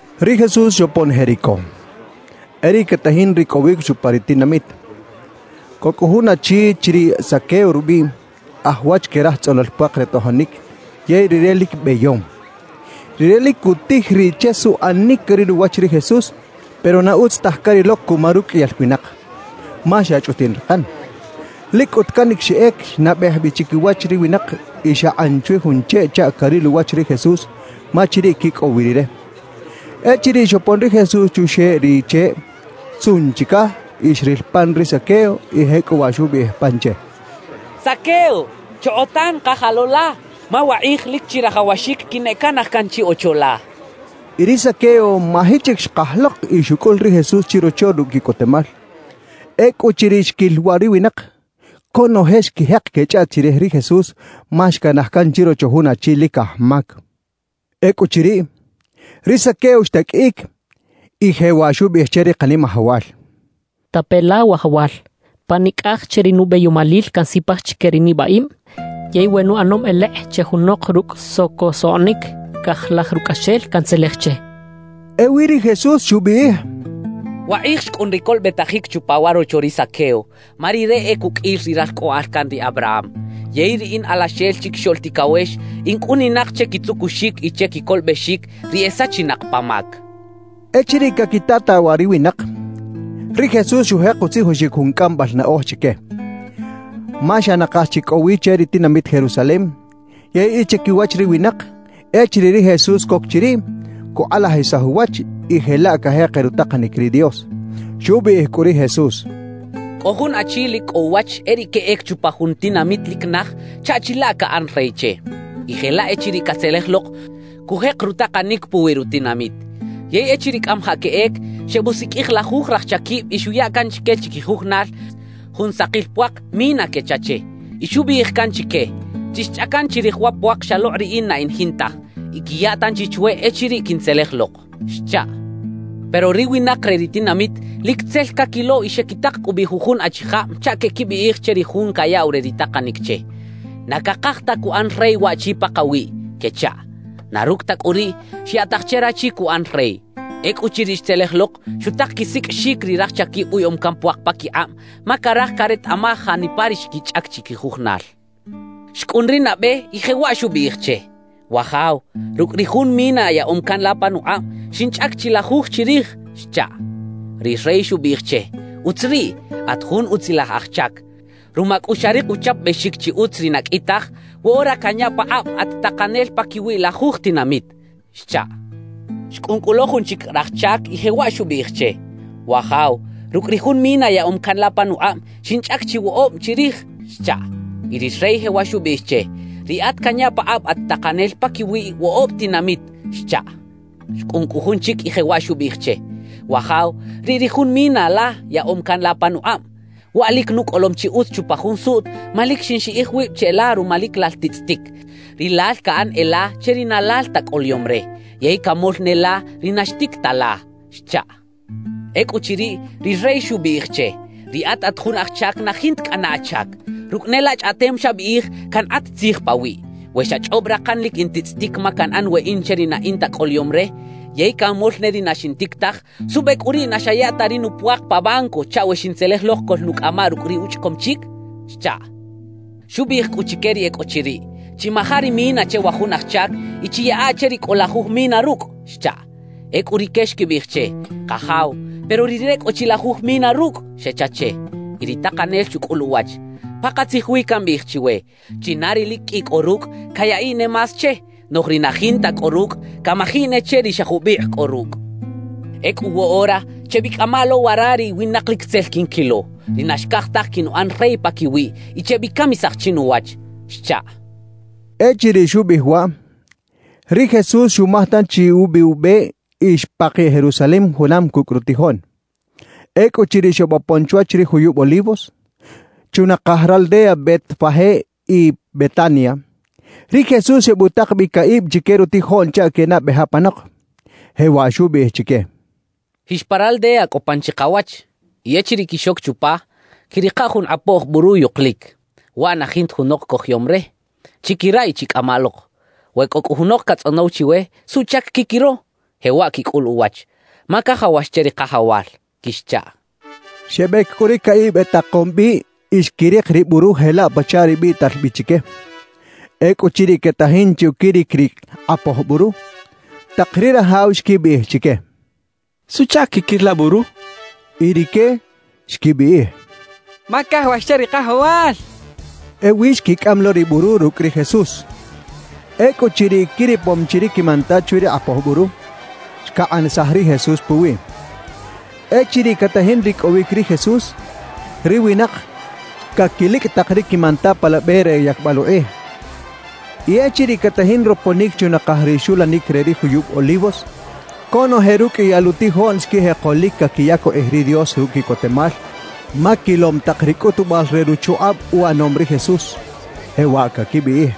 Ri Jesús xopon Jericó, e riꞌ catajin ricꞌowic chupa ri tinamit. Cꞌo cꞌu jun achi chiriꞌ Zaqueo rubiꞌ, aj wach que raj tzꞌonol puak re tojonic yey rire lic beyom. Rire lic cutij riꞌ che suꞌanic caril uwach ri Jesús, pero na utz taj carilo cuma ruqꞌuiyal winak, ma xa chꞌutiꞌn rakan. Lic cꞌut canic xeꞌec xnabej bi chiquiwach ri winak y xakꞌan chwi jun cheꞌ chaꞌ caril uwach ri Jesús, ma chiriꞌ quicꞌow wi Rire. Echiriꞌ xopon ri Jesús chuxeꞌ ri cheꞌ, xtzuꞌn chicaj y xril pan ri Zaqueo; y jecꞌuwaꞌ xubiꞌij pan che: —Zaqueo, chokꞌotan kaja lo la, ma wakꞌij lic chirajawaxic quineꞌcanaj can chi ocho la —xchaꞌ. Y ri Zaqueo maji chic xkaj lok y xucꞌul ri Jesús chirocho rucꞌ quiꞌcotemal. Ecꞌuchiriꞌ xquil waꞌ ri winak, conoje xquijek quechꞌaꞌt chirij ri Jesús ma xcanaj can chirocho jun achi lic aj mac. Ecꞌuchiriꞌ, ri Zaqueo xtaqꞌuiꞌic y jewaꞌ xubiꞌij che ri Kanimajawal: —Tape la, wajawal: Pa nicꞌaj che ri nubeyomalil cansipaj chique ri nibaꞌib; yey we nuꞌanom elekꞌ che junok rucꞌ socosoꞌnic, cajlaj rucꞌaxel cantzelej che —xchaꞌ. Ewi ri Jesús xubiꞌij: —Wakꞌij xcꞌun ri colobetajic chupa wa rocho ri Zaqueo, ma rire e cuqꞌuil ri ralcꞌoꞌal can ri Abraham. Yey ri in Alaxel Chiquixoꞌl Ticawex, in cꞌuninak che quitzucuxic y che quicolobexic ri e sachinak pa mac —xchaꞌ. Echiriꞌ caquitataꞌ waꞌ ri winak, ri Jesús xujek utzijoxic jun cꞌambal naꞌoj chique. Ma xa nakaj chi cꞌo wi che ri tinamit Jerusalem yey e chiquiwach ri winak, echiriꞌ ri Jesús coc chiriꞌ, cukꞌalajisaj uwach y jelaꞌ cajeker rutakanic ri Dios. Xubiꞌij cꞌu ri Jesús: «Cꞌo jun achi lic cꞌo uwach e riꞌ queꞌec chupa jun tinamit lic naj chaꞌ chilaꞌ caꞌan rey che; y jelaꞌ echiriꞌ catzelej lok, cujek rutakanic puwi rutinamit. Yey echiriꞌ cꞌamajaꞌ queꞌec, xebusiqꞌuij lajuj raj chaquib y xuya can chique chiquijujunal jun sakil puak “mina” quecha che y xubiꞌij can chique: “Chixchꞌacan chirij wa puak xalokꞌ riꞌin na in jintaj, y quiya tanchi chwe echiriꞌ quintzelej lok” xchaꞌ. »Pero ri winak re ri tinamit lic tzel caquilo y xequitak cꞌu bi jujun achijab chaꞌ queꞌquibiꞌij che ri jun cayaꞌw re ri takanic che: “Na cakaj ta cuꞌan rey waꞌchi pakawiꞌ” quechaꞌ. »Na rucꞌ ta cꞌu riꞌ, xyaꞌtaj che rachi cuꞌan rey. Ecꞌuchiriꞌ xtzelej lok, xutak quisiqꞌuixic ri raj chaquib uyaꞌom can puak paquikꞌab, ma caraj caretaꞌmaj janipa ri xquichꞌac chiquijujunal. »Xcꞌun ri nabe y jewaꞌ xubiꞌij che: “Wajaw, rucꞌ ri jun mina yaꞌom can la panukꞌab, xinchꞌac chi lajuj chirij” xchaꞌ. »Ri rey xubiꞌij che: “Utz riꞌ. At jun utzilaj aj chac. Ruma cꞌu xarik uchapabexic chi utz ri na qꞌui taj, woꞌora canya pakꞌab at takanel paquiwi lajuj tinamit” xchaꞌ. »Xcꞌun cꞌu lo jun chic raj chac y jewaꞌ xubiꞌij che: “Wajaw, rucꞌ ri jun mina yaꞌom can la panukꞌab, xinchꞌac chi woꞌob chirij” xchaꞌ. »Y ri rey jewaꞌ xubiꞌij che: “Riꞌat canya pakꞌab at takanel paquiwi woꞌob tinamit” xchaꞌ. »Xcꞌun cꞌu jun chic y jewaꞌ xubiꞌij che: “Wajaw, riꞌ ri jun mina la yaꞌom can la panukꞌab. Waꞌ lic nucꞌolom chi utz chupa jun suꞌt ma lic xinxiꞌij wib cheꞌla ruma lic lal titzꞌitic. Rilal caꞌan e la che ri na lal ta cꞌoloyom re, yey camol ne la ri na xtic ta la” xchaꞌ. »Ecꞌuchiriꞌ, ri rey xubiꞌij che: “Riꞌat at jun aj chac na jinta cꞌana achac. Rucꞌ ne la chꞌaꞌtem xabiꞌij, cankꞌat tzij pawiꞌ. We xachꞌob rakan lic in titzꞌitic ma canꞌan weꞌin che ri na in ta incꞌoloyom re, yey canmol ne ri na xintic taj, ¿suꞌbe cꞌu riꞌ na xaya ta ri nupuak pa banco chaꞌ we xintzelej lok coꞌlnucꞌamaꞌ rucꞌ ri uchꞌacom chic?” xchaꞌ. »Xubiꞌij cꞌu chique ri e cꞌo chiriꞌ: “Chimaja ri mina che wa jun aj chac y chiyaꞌa che ri cꞌo lajuj mina rucꞌ” xchaꞌ. »Ecꞌu rique xquibiꞌij che: “Kajaw, ¡pero rire cꞌo chi lajuj mina rucꞌ!” xecha che. »Y ri takanel xucꞌul uwach: “Pakatzij wi cambiꞌij chiwe: China ri lic qꞌui cꞌo rucꞌ, cayaꞌiꞌ ne más che; noꞌj ri na jinta cꞌo rucꞌ, camajiꞌ ne che ri xa jubikꞌ cꞌo rucꞌ. Ecꞌu woꞌora, chebicꞌama lo wara ri winak lic tzel quinquilo, ri na xcaj taj quinuꞌan rey paquiwiꞌ, y chebicamisaj chinuwach” xchaꞌ.» Echiriꞌ xubiꞌij waꞌ, ri Jesús xumaj tanchi ubi ube y xpakiꞌ Jerusalem junam cucꞌ rutijoꞌn. Ecꞌuchiriꞌ xebopon chwach ri juyub Olivos, chunakaj raldeas Betfagé y Betania, ri Jesús xebutak bi caꞌib chique rutijoꞌn chaꞌ quenabej apanok, jewaꞌ xubiꞌij chique: «Jix pa raldea cꞌo pan chikawach. Y echiriꞌ quixoc chupa, quiꞌrika jun kꞌapoj buru yukulic. Waꞌ na jinta junok cojoyom re. Chiquiraꞌ y chicꞌamaꞌ lok. We cꞌo cꞌu junok catzꞌonow chiwe: “¿Suꞌchac quiquiro?”, jewaꞌ quicꞌul uwach: “Ma cajawax che ri Kajawal” quixchaꞌ.» Xebec cꞌu ri caꞌib etakom bi y xquirik ri buru jelaꞌ pachaꞌ ri biꞌtal bi chique. Ecꞌuchiriꞌ quetajin che uquiric ri kꞌapoj buru, tak ri rajaw xquibiꞌij chique: —¿Suꞌchac quiquir la buru? —xechaꞌ. Y rique xquibiꞌij: —Ma cajawax che ri Kajawal —xechaꞌ. Ewi xquicꞌam lo ri buru rucꞌ ri Jesús. Ecꞌuchiriꞌ quiripom chi ri quimanta chwi ri kꞌapoj buru, xcakꞌanisaj ri Jesús puwiꞌ. Echiriꞌ catajin ricꞌowic ri Jesús, ri winak caquilicꞌ tak ri quimanta pa la be re yacbal ukꞌij. Y echiriꞌ catajin roponic chunakaj ri xulanic re ri juyub Olivos, conoje ruqꞌuiyal utijoꞌn xquijeko lic caquiyac ukꞌij ri Dios rucꞌ quiꞌcotemal ma quilom tak ri cꞌutubal re ruchukꞌab uꞌanom ri Jesús, jewaꞌ caquibiꞌij: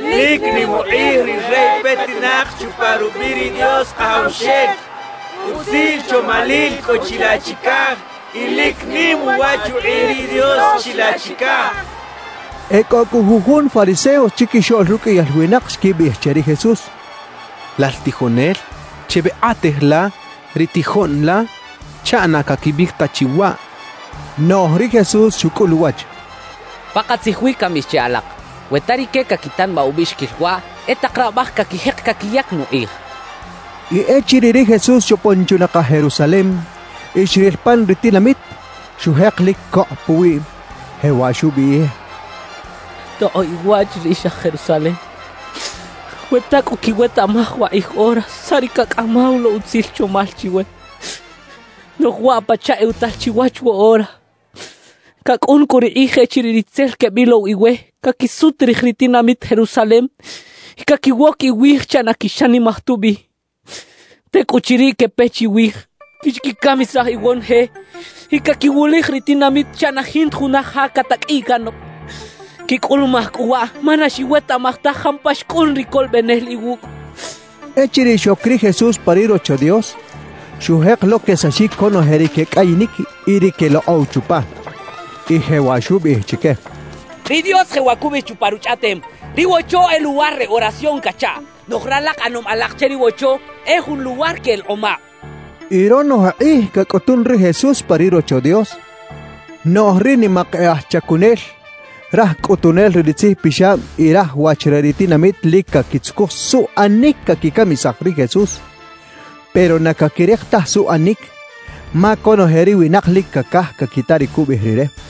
«¡Lic nim ukꞌij ri Rey petinak chupa rubiꞌ ri Dios Kajawxel! ¡Utzil chomalil cꞌo chilaꞌ chicaj y lic nim uwach ukꞌij ri Dios chilaꞌ chicaj!» quechaꞌ. E cꞌo cꞌu jujun fariseos chiquixoꞌl ruqꞌuiyal winak xquibiꞌij che ri Jesús: —Lal tijonel, chebekꞌatej la ri tijoꞌn la chaꞌ na caquibiꞌij ta chi waꞌ —xechaꞌ. Noꞌj ri Jesús xucꞌul uwach: —Pakatzij wi cambiꞌij che alak, we ta rique caquitanabaꞌ ubiꞌxiquil waꞌ, e tak rabaj caquijek caquiyac nukꞌij —xchaꞌ. Y echiriꞌ ri Jesús xopon chunakaj Jerusalem y xril pan ri tinamit, xujek lic cokꞌ puwiꞌ, jewaꞌ xubiꞌij: «¡Tokꞌoꞌ iwach riꞌix aj Jerusalem! ¡We ta cꞌu quiwetaꞌmaj wakꞌij ora saꞌ ri cacꞌamaw lo utzil chomal chiwe! Noꞌj waꞌ pachaꞌ ewatal chiwach woꞌora. Cacꞌun cꞌu ri kꞌij echiriꞌ ri tzel quebilow iwe caquisut rij ri tinamit Jerusalem y caquiwoc iwij chaꞌ na quixanimaj tubi. Tecꞌuchiriꞌ, quepe chiwij. Quixquicamisaj iwonoje y caquiwulij ri tinamit chaꞌ na jinta juna ja cataqꞌuiꞌ canok. Quicꞌulumaj cꞌu waꞌ ma na xiwetaꞌmaj taj jampa xcꞌun ri Colobenel iwucꞌ» xchaꞌ. Echiriꞌ xoc ri Jesús pa ri Rocho Dios, xujek lo quesaxic conoje ri quecꞌayinic y ri quelokꞌow chupa. Y jewaꞌ xubiꞌij chique: «Ri Dios jewaꞌ cubiꞌij chupa Ruchꞌaꞌtem: Ri Wocho e luwar re oración cachaꞌ. Noꞌj ralak ꞌanom alak che ri Wocho e jun luwar que elekꞌomab» xchaꞌ. Y ronoje kꞌij cacꞌutun ri Jesús pa ri Rocho Dios; noꞌj ri nimak e aj chacunel, raj cꞌutunel re ri tzijpixab y raj wach re ri tinamit lic caquitzucuj suꞌanic caquicamisaj ri Jesús. Pero na caquirik taj suꞌanic, ma conoje ri winak lic cacaj caquita ri cubiꞌij Rire.